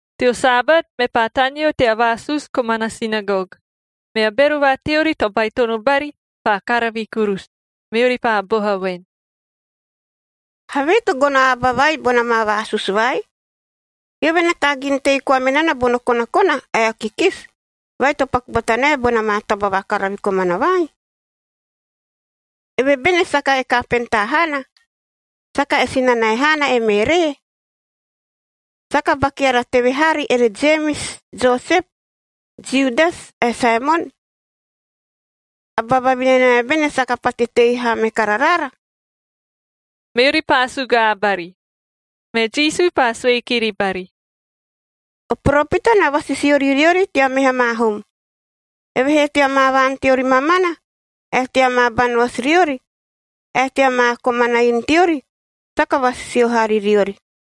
Teo Sabat, mepaa taneo tea vaasusu komana sinagog, mea bero va teori to baitono bari paa karavi kurusu, meori paa boha voen, “Havee to gono a aba vai bona maa vaasusu vai? Eove na taagin tei koa me nana bono konakona ae o kikisi vai to paku bata nae bona maa taba vakaravi komana vai? Eve bene saka e kapentaa haana? Saka e sinanae haana e Meeree? Saka ba keara teve haari ere Jemis, Josep, Judas ae Saemon? A ba vavinanae bene saka pate tei haa me kararaara?” Meori paa sugaa bari. Me Jisu paa sue kiri bari, “O poropita na vasisio ri riori tea meha maa hum, evehee tea maa vaan teori mamana ae tea maa banoasi riori, ae tea maa komana inu teori, saka vasisio haa ri riori.”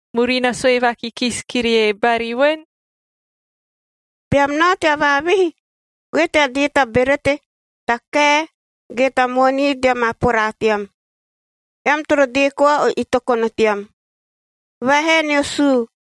murina sue vakikisi kirie bari voen: “Beam nao tea vaavihi, goe tea dee ta berete, ta kae, ge ta moonii tea maa poraa team. Eam toro dee koa o itokono team. Vaahae nio suu.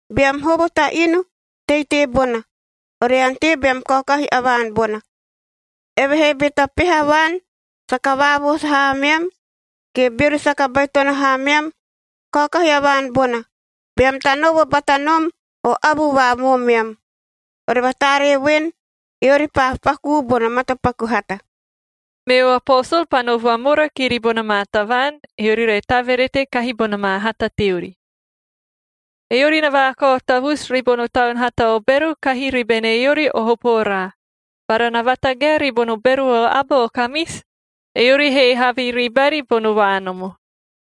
Beam hovo ta inu, tei teebona, ore ante beam kaokahi a vaan bona. Evehee be ta peha vaan saka vaavoosu haa ameam, ge beori saka baitono haa ameam, kaokahi a vaan bona, beam tanovo bata nom o avu va moomeam. Ore vataaree voen, eori paa pakuu bono matapaku hata.” Meo aposol paa no vamora kiri bona maa tavaan, eori re taverete kahi bona maa hata teori. Eori na vaakao tavusu ribono taun hata o bero kahi ribene eori o hopo oraa, bara na vatagae ribono bero o aba o kamisi, eori he havi ribari bono vaanomo.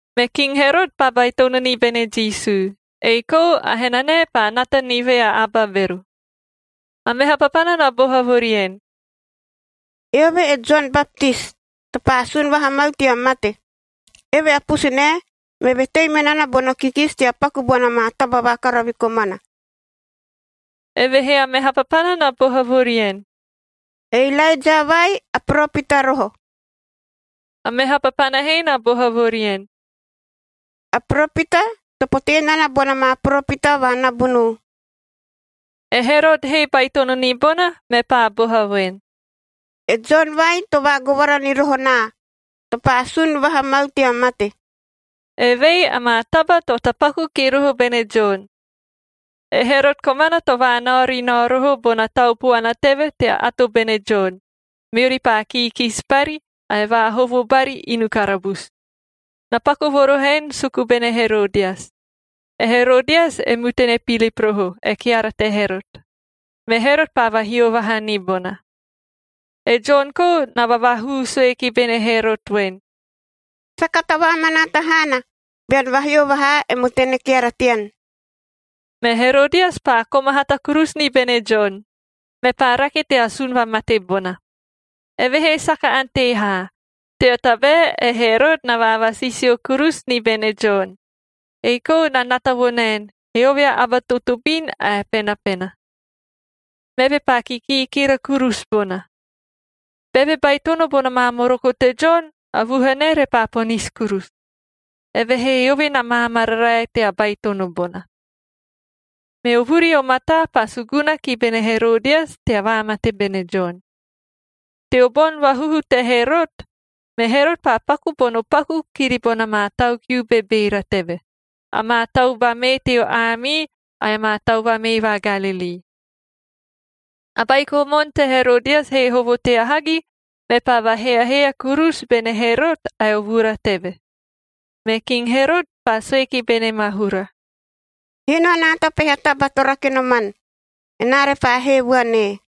Me King Herot paa baitono ni bene Jisu, ei kou a henanae paa nata ni vea aba bero. A meha papana na boha vo rien, “Eove e Jon Baptis to paa sun vaha mau tea mate. Eve a pusunae meve tei me nana bono kikisi tea paku bona maa taba vakaravi komana.” Evehee a meha papana na boha vo rien, “E Ilaeja vai, a poropita roho.” A meha papana he na boha vo rien, “A poropita, to potee nana bona maa poropita va nabunuu.” E Herot he baitono ni bona, mepaa boha voen, “E Jon vai to vaagovara ni roho naa, to paa sun vaha mau tea mate.” Evei amaa taba to tapaku ki roho bene Jon: E Herot komana to vaanao ri nao roho bona tau puana teve tea ato bene Jon, meori paa kiikisi bari, ae vaahovo bari inu karabusu. Na paku vo roho en suku bene Herodias. E Herodias e mutane Pilip roho, e keara te Herot, me Herot paa vahio vaha ni bona. E Jon kou na vavaahuu sue ki bene Herot voen, “Saka tavaamanaata haana bean vahio vaha e mutane keara tean.” Me Herodias paa koma hata kurusu ni bene Jon, mepaa rake tea asun vamate bona. Evehee saka ante haa, tea tabae e Herot na vaavasisio kurusu ni bene Jon, ei kou na nata vo naen, eove a aba a totobin ae a penapena. Meve paa kikiikira kurusu bona. Beve baitono bona maa moroko te Jon, a vuhanae repaa ponisi kurusu, evehee eove na maamararae tea baitono bona. Meo vuri o mataa paa suguna ki bene Herodias tea vaamate bene Jon. Teo boni vahuhu te Herot, me Herot paa paku bono paku kiri bona maa tau kiu bebeera teve, amaa tau vamee teo aamii ae amaa tau vamee va Galilii. A baiko moon te Herodias he hovo tea hagi,b mepaa vaheahea kurusu bene Herot ae o vura teve. Me King Herot paa sue ki bene maahura, “Hino anaa ta peha taba to rake noman, enaa repaa hee vuan ee.”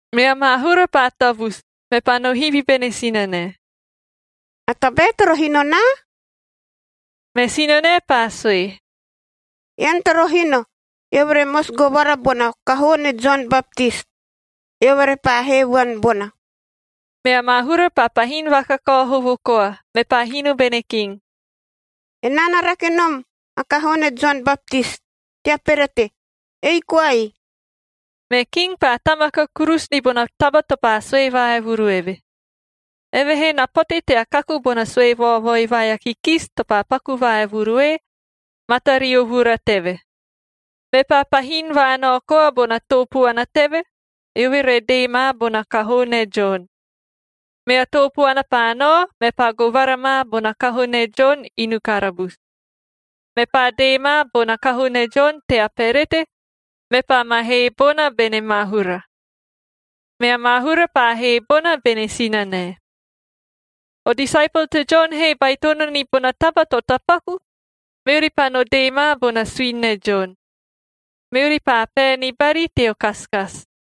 Mea maahura paa tavusu, mepaa no hivi bene sinanae, “A tabae toro hino naa?” Me sinanae paa sue, “Ean toro hino, eove re mosi govara bona kahoo ne Jon Baptis, eove repaa hee vuan bona.” Mea maahura paa pahin vakakao hovo koa, mepaa hino bene king, “Enaa na rake nom a kahoo ne Jon Baptis tea perete, ei koai!” Me king paa tamaka kurusu ni bona taba to paa sue vaevuru eve. Evehee na pote tea kaku bona sue vaovoi vai a kikisi to paa paku vaevuru ee, matario vura teve. Mepaa pahin vaanao koa bona too puana teve, eove re dee ma bona kahoo ne Jon. Mea too puana paa nao, mepaa govara ma bona kahoo ne Jon inu karabusu. Mepaa dee ma bona kahoo ne Jon tea perete, mepaa ma hee bona bene maahura. Mea maahura paa hee bona bene sinanae. O disaepol te Jon he baitono ni bona taba to tapaku, meori paa no dee ma bona suini ne Jon. Meori paa pae ni bari teo kasikasi.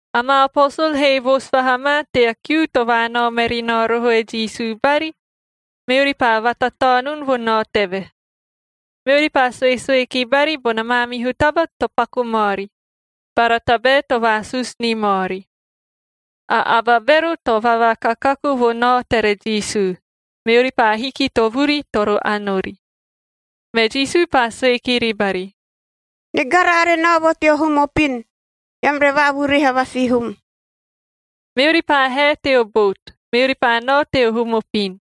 Amaa aposol he voosu vaha ma tea kiu to vaanao meri nao roho e Jisu bari, meori paa vatataonun vo nao teve. Meori paa suesue ki bari bona maamihu taba to paku maori, bara tabae to vaasusu ni maori. A aba bero to vavakakaku vo nao tere Jisu, meori paa hiki to vuri toro ani ori. Me Jisu paa sue kiri bari, “Nigara are nao vo teo hum opin, eam re vaavuriha va sihum.” Meori paa hae teo bout, meori paa nao teo hum opin.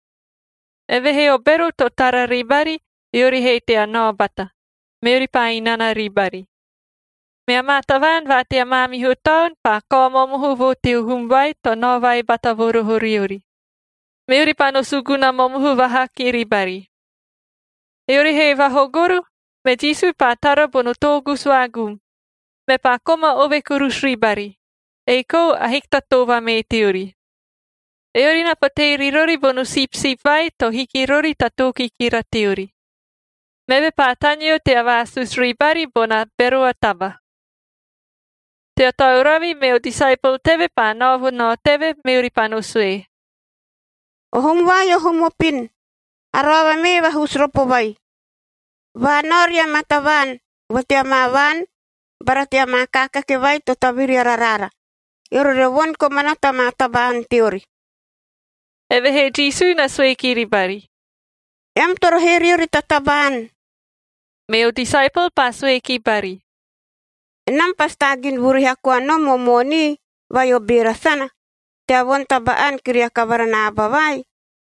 Evehee o bero to tara ribari, eori he tea nao bata, meori paa inana ribari. Mea maa tavaan va tea maamihu taon paa kao momohu vo teo hum vai to nao vai bata vo roho riori, meori paa no suguna momohu vaha kiri bari. Eori he vahogoro, me Jisu paa tara bono toogusu vaagum, mepaa koma ove kurusu ribari, ei kou ahiki ta too vamee teori. Eori na potee ri rori bono sipsip vai to hiki rori ta too kikira teori. Meve paa taneo tea vaasusu ribari bona bero a taba. Tea tauravi, meo disaepol teve paa nao vo nao teve, meori paa no sue, “O hum vai o hum opin, a roava mee vahusu ropo vai. Vaanao ria maa tavaan vo tea maa vaan bara tea maa kaakake vai to taviri araraara, eori re voni komana ta maa taba-ani teori.” Evehee Jisu na sue kiri bari, “Eam toro hee riori ta taba-ani.” Meo disaepol paa sue ki bari, “Enam pasi taagin vuriha koa nom o moonii vai o beera sana tea voni taba-ani kiria kavara na aba vai?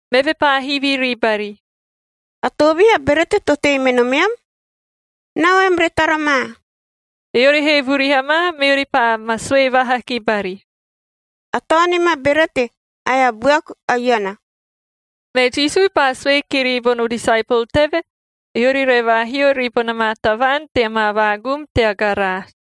Meve paa hivi ribari, “A toovihi a berete to tei me nomeam? Nao eam re tara ma.” Eori he vuriha ma, meori paa ma sue vaha ki bari, “A taonim a berete ae a buaku a iana.” Me Jisu paa sue kiri bono disaepol teve, eori re vaahio ribona maa tavaan tea maa vaagum tea garaasi.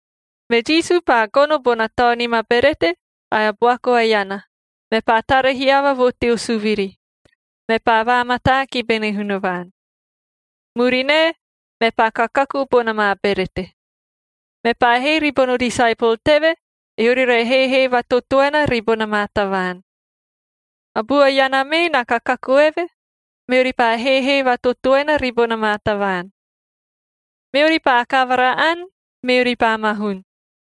Me Jisu paa gono bona taonim a berete ae a buaku a iana, mepaa tara hiava vo teo suviri, mepaa vaamataa ki bene Hunavaan. Murinae, mepaa kakaku bona maa berete. Mepaa hee ribono disaepol teve, eori re heehee vatotoena ribona maa tavaan. A bua iana mee na kakaku eve, meori paa heehee vatotoena ribona maa tavaan. Meori paa kavara ani, meori paa mahun.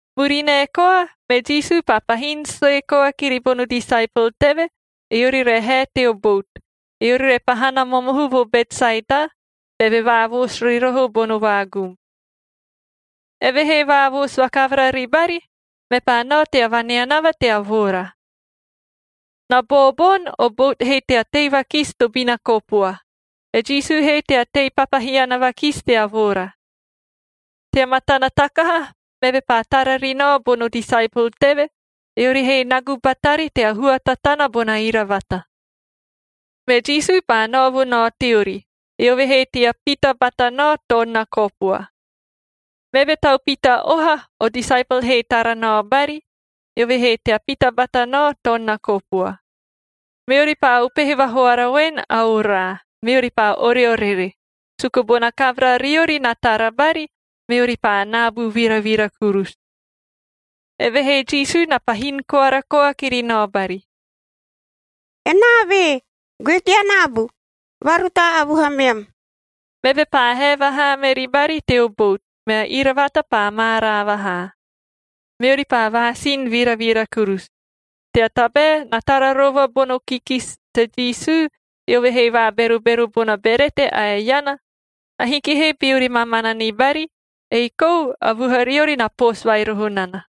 Murinae koa, me Jisu paa pahin sue koa kiri bono disaepol teve, eori re hae teo bout, eori re pahana momohu vo Betsaeda, beve vaavoosu ri roho bono vaagum. Eve he vaavoosu vakavara ribari, mepaa nao tea vaneanava tea voora. Na booboni, o bout he tea tei vakisi tobina kopua, e Jisu he tea tei papahiana vakisi tea voora. Tea matana takaha, meve paa tara ri nao bono disaepol teve, eori he nagu batari tea hua tatana bona iravata. Me Jisu paa nao vo nao teori, eove he tea pita bata nao toon na kopua. Meve tau pita oha, o disaepol he tara nao bari, eove he tea pita bata nao toon na kopua. Meori paa upehe vahoara voen a oraa, meori paa oreorere, suku bona kavara riori na tara bari, meori paa naabu viravira kurusu. Evehee Jisu na pahin koara koa kiri nao bari, “Enaa ve! Goe tea naabu. Vaarutaa a vuhameam!” Meve paa hae vahaa meri bari teo bout, mea iravata paa maaraa vahaa. Meori paa vaasin viravira kurusu, tea tabae na tara rova bono kikisi te Jisu, eove he vaaberobero bona berete ae a iana, ahiki he beori mamana ni bari, ei kou a vuhariori na poosu vai roho nana.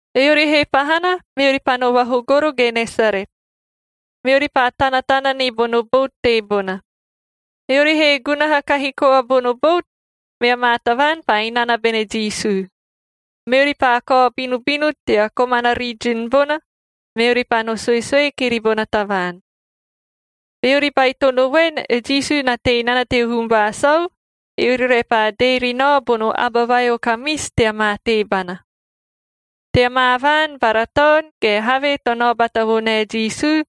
Eori he pahana, meori paa no vahogoro Genesaret. Meori paa tanatana ni bono bout teebona. Eori he gunaha kahi koa bono bout, mea maa tavaan paa inana bene Jisu. Meori paa kao binubinu tea komana rijin bona, meori paa no suesue kiri bona tavaan. Beori baitono voen, e Jisu na tei nana teo hum va sau, eori repaa dee ri nao bono aba vai o kamisi tea maa teebana. Tea maa vaan bara taon, ge havee to nao bata vo nae Jisu,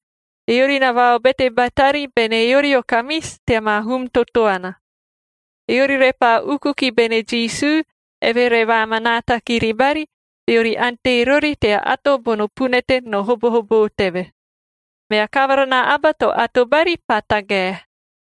eori na vaobete batari bene eori o kamisi tea maa hum totoana. Eori repaa uku ki bene Jisu, eve re vaamanaata kiri bari beori ante rori tea ato bono punete no hobohoboo teve. Mea kavara na aba to ato bari paa tagae.